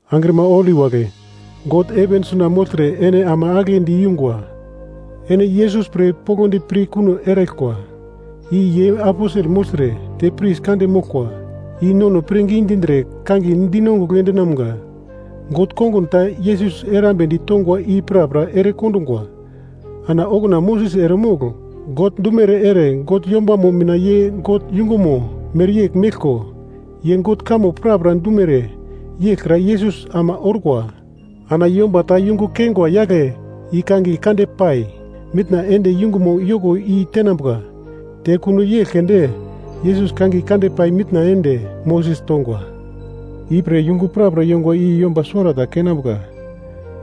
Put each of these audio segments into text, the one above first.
Angrima holi wagle, God heven suna mogltre ene ama agle diyungwa. Ene Yesus pre poglodi pir kuno eraglkwa, i ye aposel mogltre te pris kande moglkwa i nono pirngi dindre kangiye dinongugl endumga. God kongun ta Yesus erambedi tongwa i prapra ere kondungwa. Ana okuna Moses eremogl God dumere ere God yombamo mina ye God yungumo mereyegl meglko, ye God kamo prapra dumere yeglkra Yesus ama orkwa. Ana yomba ta yungu keingwa yagle i kangiye kande pai mitna ende yungumo yoko i tenambuka. Te kuno yegl keunde, Yesus kangiye kande pai mitna ende Moses tongwa. Ipre yungu prapra yongwa i yomba suwarata keinambuka,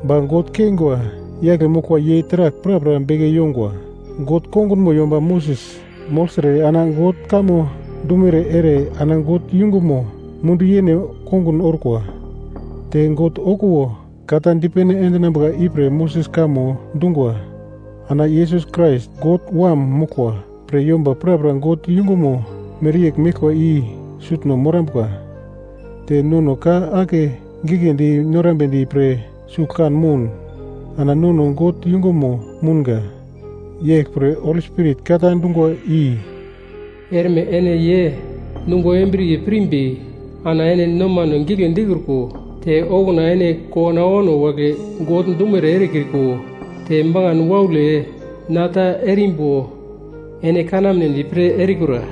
ba God keingwa yagle moglkwa ye taragl prapra beke yongwa. God kongunmo yomba Moses mogltre, ana God kamo dumere ere ana God yungumo mundu yene kongun orkwa. Te God okuwo ka ta dipene endinambuka ipre Moses kamo dungwa. Ana Yesus Krais God wam moglkwa pre yomba prapra God yungumo mereyegl meglkwa i sutno morambuka. Te nono ka ake giglendi norambedi pre sugl kan moun. Ana nono God yungunmo mounga. Yeglpre, Holi Spirit ka ta dungwa i: “Erme ene ye nungo embriye pirimbi, ana ene nomane gigle dikriko, te okuna ene kowano awano wagle God dumere erekriko, te makan waule na ta erimbo ene kanamedi pre erikura.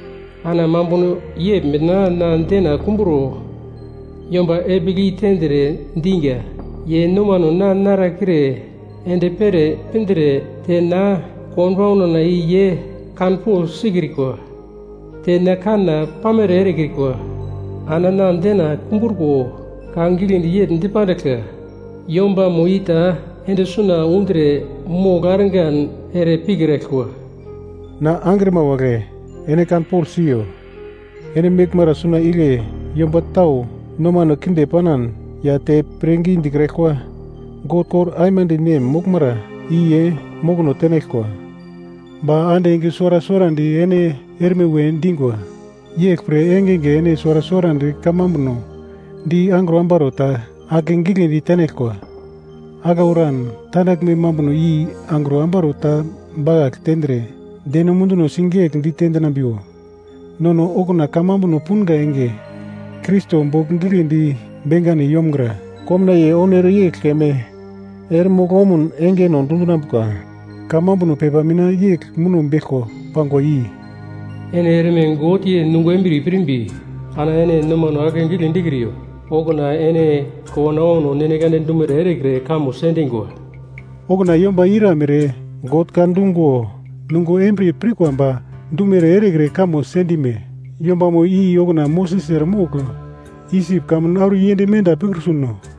Ana mambuno yegl mina na dena kumburo yomba epigl i tendre, dinga, ‘Ye nomano na narekre ende pere pindre, te na konbauna i ye kanpogl sikrikwa. Te na kana pamere erekrikwa.’ Ana na dena kumbruko ka giglendi yegl dipandiglka, ‘Yombamo i ta ende suna undre mogl argan ere pikraglkwa.’” Na angrima wagle, ene kanpogl siyo, ene meglmara suna igle yomba tau nomano kinde panan ya te pirngi dikraglkwa, God kor aimande nem moglmara i ye mokono tenaglkwa. Ba ande enge suwara suwarandi ene erme we dingwa. Yeglpre engenge ene suwara suwarandi kamambuno di angro ambaro ta akegiglendi tenaglkwa. Aglau eran tandaglme mambuno i angro ambaro ta bakagl tendre deno munduno sigegl dite dinambiwo. Nono okuna kamambuno punga enge, Krais bogl giglendi bengane yomgra, komnaiye oun ere yegl keme ere mogl omun engeno dundinambuka. Kamambuno pepa mina yegl muno beglko pangwa i: “Ene erme God ye nungo embriye pirimbi ana ene nomane akegigle dikriyo, okuna ene kowano awano God dumere erekre kamo sendingwa.” Okuna yomba iramere God ka dungo nungo embriye pirkwa ba dumere erekre kamo sendune? Yombamo i okuna Moses eremogl Isip kamun auro yend menda pikrutuno?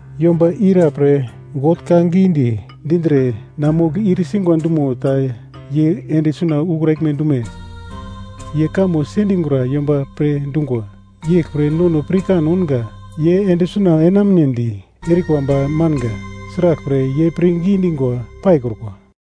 Yomba ira pre God ka gidi dindre na mogl ir singwa dumo ta ye ende suna ukraglme dume? Ye kamo sendingura yomba pre dungwa. Yeglpre nono pirkan ounga ye ende suna enamunedi erikwa ba manga, sraglpre ye pirngi dingwa paikrukwa.